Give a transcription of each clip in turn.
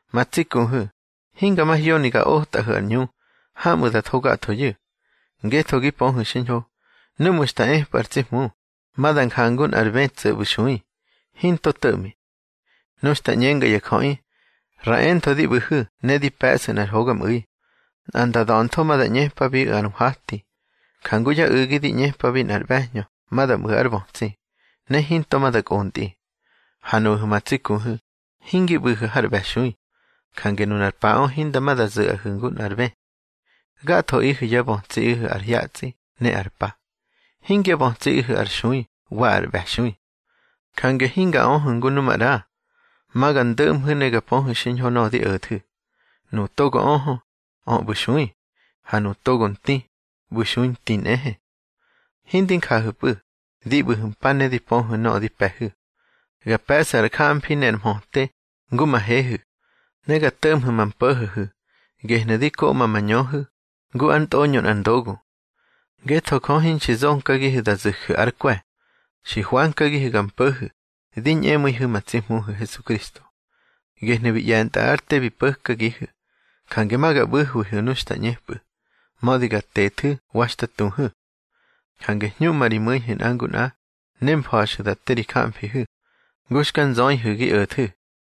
Ma tsi kuhu̱, hinga mahyoni ga otꞌahu̱ ar ꞌñu hamꞌu̱ da tho gathoyu̱. Ngetho gi pöhu̱ xiñho, núꞌmu̱ xta epꞌu̱ ar tsi Hmu, ma da njangu nꞌar bë tso̱ ꞌbu̱ nxui, hinto to̱ꞌmi. Nu xta ꞌñenga ya jöꞌi: Ra entho di ꞌbu̱hu̱ ne di pe̱ꞌsu̱ nꞌar hogamꞌu̱i, nꞌa nda da̱ntho ma da ꞌñepabiꞌu̱ ar nhwati, jangu yá u̱gi di ꞌñepabi nꞌar ꞌbe̱hñö ma da mꞌu̱ ár bötsi, ne hinto ma da kꞌontꞌi. Ha nuꞌahu̱ ma tsi kuhu̱, hingi ꞌbu̱hu̱ har ꞌbe̱xui, jange nunar paꞌö hinda ma da zu̱ꞌahu̱ ngu nꞌar bë. Gathoꞌihu̱ yá bötsiꞌihu̱ ar hyatsꞌi ne ar pa. Hingyá bötsiꞌihu̱ ar xui wa ar ꞌbe̱xui. Jange hinga öhu̱ ngu nu maꞌra. Ma ga ndöꞌmhu̱ ne ga pöhu̱ xiñho nöꞌö di o̱thu̱. Nuꞌu̱ togo öhö, ö ꞌbu̱ nxui, ha nuꞌu̱ togo nti, ꞌbu̱ nxui nti nꞌehe. Hindi njahu̱pꞌu̱, di ꞌbu̱hu̱ mpa, ne di pöhu̱ nöꞌö di pe̱hu̱. Ga pe̱ꞌsu̱ ar jamfri ne ar mhöte ngu ma hehu̱. Ne ga to̱ꞌmhu̱ ma mpo̱ho̱hu̱, gehnu̱ di koꞌma ma ñöhu̱, ngu ár ntꞌoñö nꞌar ndogu. Ngetho Jö hinxi zonkagihu̱ da zu̱ju̱ ár kwe̱. Xi hwankagihu̱ ga mpo̱hu̱ di ñꞌemu̱ihu̱ ma tsi Hmuhu̱ Hesukristo, gehnu̱ bi ꞌye̱ntꞌa ár te bi po̱kagihu̱. Jange ma ga ꞌbu̱hwihu̱ nu xta ꞌñepꞌu̱, mödi ga tethu̱ wa xta tuhu̱. Jange hñuꞌma ri mu̱ihu̱ nꞌa ngu nꞌa, ne mfa̱xu̱ da te ri jamfihu̱, ngu xka nzöihu̱ gi o̱thu̱.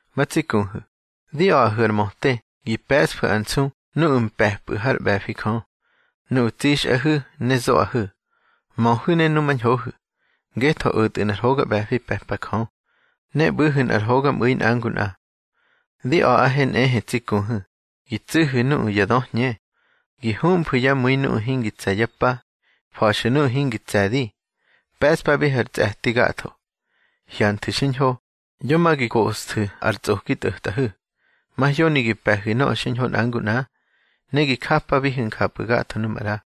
Ma tsi kuhu̱, di a̱ꞌahu̱ ar möte gi pe̱ꞌsfu̱ ar nsu nuꞌu̱ mpe̱pꞌu̱ hár ꞌbe̱fi Jö, nuꞌu̱ tsixꞌahu̱ ne zoꞌahu̱. Möhu̱ ne numañhohu̱, ngetho o̱tꞌu̱ nꞌar hoga ꞌbe̱fi pe̱pa Jö. Ne ꞌbu̱hu̱ nꞌar hogamꞌu̱i nꞌa ngu nꞌa. Di a̱ꞌahe nꞌehe tsi kuhu̱, gi tsú̱hu̱ nuꞌu̱ ya döhñe, gi humfu̱ yá mu̱i nuꞌu̱ hingi tse̱ yá pa, fa̱xu̱ nuꞌu̱ hingi tse̱di, pe̱ꞌspabihu̱ ar tsꞌe̱ti gatho. Hyanthu̱ xiñho, yo ma gi koꞌsthu̱ ar tsꞌoki tꞌo̱tꞌahu̱. Mahyoni gi pe̱hu̱ nöꞌö xiñho nꞌa ngu nꞌa, ne gi japabihu̱ njapꞌu̱ gatho nu maꞌra.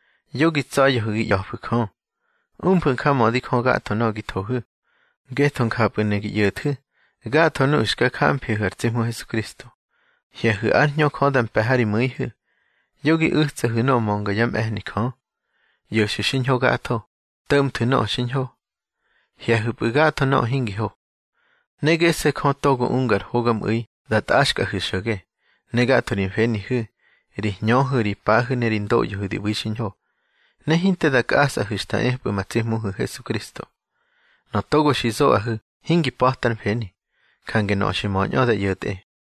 Yo gi tsa̱ya̱hu̱ gi ꞌya̱fu̱ Jö. Umfu̱ njamödi Jö gatho nöꞌö gi thohu̱, ngetho njapꞌu̱ ne gi ꞌyo̱thu̱ gatho nuꞌu̱ xka jamfihu̱ ar tsi Hmu Hesukristo. Hye̱hu̱ ár Hñö Jö da mpe̱ ha ri mu̱ihu̱. Yo gi u̱tsahu̱ nöꞌö mönga yá mꞌe̱hni Jö. ꞌYo̱xu̱ xiñho gatho, tsömhu̱ nöꞌö xiñho. Hye̱hu̱pꞌu̱ gatho nöꞌö hingi ho. Ne gese̱ Jö togo unga ar hogamꞌu̱i da tꞌaxkꞌahu̱ xo̱ge, ne gatho ri mfenihu̱, ri hñöhu̱, ri pahu̱ ne ri ndoꞌyohu̱ di ꞌbu̱ xiñho, ne hinte da kꞌasꞌahu̱ xta epꞌu̱ ma tsi Hmuhu̱ Hesukristo. Nöꞌö togo xi zoꞌahu̱ hingi pa̱ta ár mfeni, jange nöꞌö xi möñꞌö da ꞌyo̱tꞌe.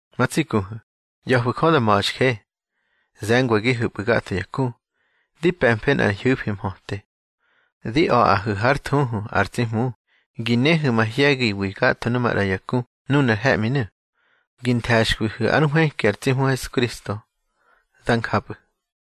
Ma tsi kuhu̱, ꞌya̱fu̱ Jö da ma̱xje. Ze̱ngwagihepꞌu̱ gatho ya ku, di pe̱mfe nꞌar ñhu̱fi mhöte. Di a̱ꞌahu̱ hár thuhu ar tsi Hmu gi néhu̱ mahye̱giwi gatho nu maꞌra ya ku nunar he̱ꞌminu̱. Gi nthe̱xkwihu̱ ár nhwëki ar tsi Hmu Hesukristo. Dá njapꞌu̱.